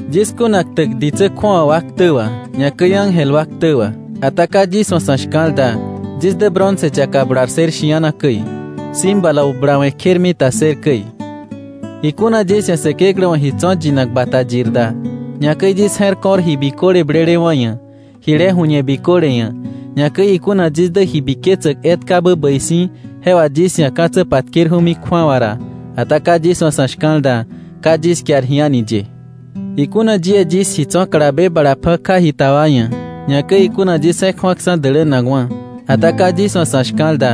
Yis kuna ktäk ditsä kju̱awa wa ktä wà, ñakäi ángel wa ktä wà, ata ka yis wa̱ sa̱ shka̱l da, yis dä bronce yaka bular ssër shi̱ana käi, címbalo bulawe̱ kjermita ssër käi. Ikuna yis ia̱ Säkeklä wa̱ ji tso̱ yinak bata yir da, ñakäi yis je̱r ko̱r ji biköle blelewa̱ ia̱, jile ju̱ñe biköle ia̱, ñakäi ikuna yis dä ji biketsäk etkabä bäi si̱ je wà yis ia̱ ka̱tsä patkerju̱mi kju̱awa ra, ata ka yis wa̱ sa̱ shka̱l da, ka yis kiar ji a̱ni ye. Ikuna yie yis ji tso̱ kalabe bala pja̱ ka jita wa ia̱, ñakäi ikuna yis je̱k ju̱aksa̱ dälänakwa̱, ata ka yis wa̱ sa̱ shka̱l da,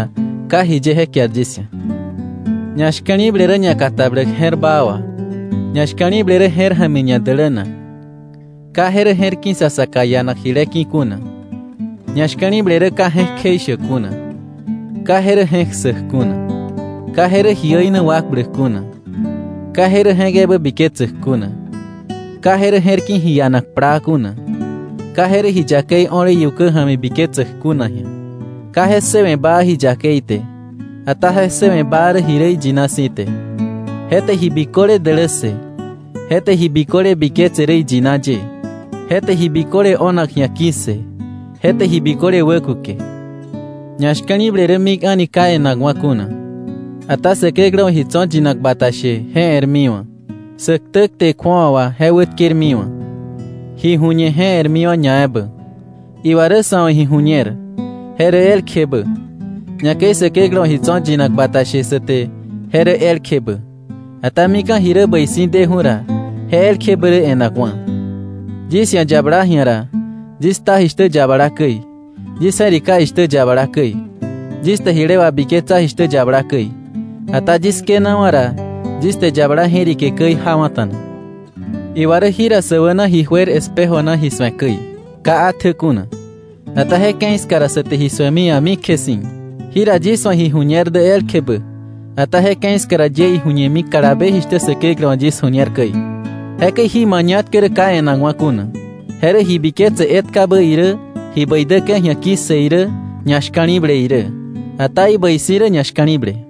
ka jiye je kiar yis ia̱. Ñashka̱li̱ble rä ñakatabläk je̱r baa wà. Ñashka̱li̱ble rä je̱r ja̱mi ñadälänak. Ka je rä je̱r ki̱ sa saka ianak jile ki̱ kuna. Ñashka̱li̱ble rä ka je̱k kjeishäk kuna, ka je rä je̱k ssäk kuna, ka je rä ji äina wakbläk kuna, ka je rä je̱k ebä biketsäk kuna, ka je rä je̱r ki̱ ji ianak plaa kuna, ka je rä ji yakei o̱le iukä ja̱mi biketsäk kuna ji̱a, ka je ssëwe̱ baa ji yakei te, ata je ssëwe̱ baa rä ji rä iyina si̱ te. Je te ji biköle dälässë, je te ji biköle biketse rä iyina ye, je te ji biköle o̱nak ji̱a ki̱ssë, je te ji biköle wäkuke. Ñashka̱li̱ble rä mik a̱ni ka e̱nakwa̱ kuna. Ata Säkeklä wa̱ ji tso̱ yinak bata she, je e̱rmiwa̱. Sä ktä kte kju̱awa wà, je wätkermiwa̱. Ji ju̱ñe je e̱rmiwa̱ ñaebä. Iwa rä sa̱ wa̱ ji ju̱ñer, je rä elkjebä. Ñakäi Säkeklä wa̱ ji tso̱ yinak bata she sa te, je rä elkjebä. Ata mika̱ ji rä bäi si̱ deju̱ ra, je elkjebä rä e̱nakwa̱. Yis ji̱a yabala ji̱a ra, yis kta jishtä yabala käi, yis je̱rika jishtä yabala käi, yis te jile wabiketsa jishtä yabala käi. Ata yis kënawa̱ ra, yis te yabala je̱rike käi jawa̱ta̱na. Iwa rä jira sä wäna ji juer espejo na ji su̱e käi, ka atjä kuna. Ata je ke̱i ska ra, sä te ji su̱emi a̱mikje si̱. Jira yis wa̱ ji ju̱ñer dä elkjebä. Ata je ke̱i ska ra, yie iju̱ñemi kalabe jishtä Säkeklä wa̱ yis ju̱ñer käi. Jekäi jí mañatkä rä ka e̱nakwa̱ kuna, je rä ji biketse etkabä irä, ji bäi däke̱ ji̱a ki̱ssë irä, ñashka̱li̱ble irä. Ata ibäi si̱ rä ñashka̱li̱ble.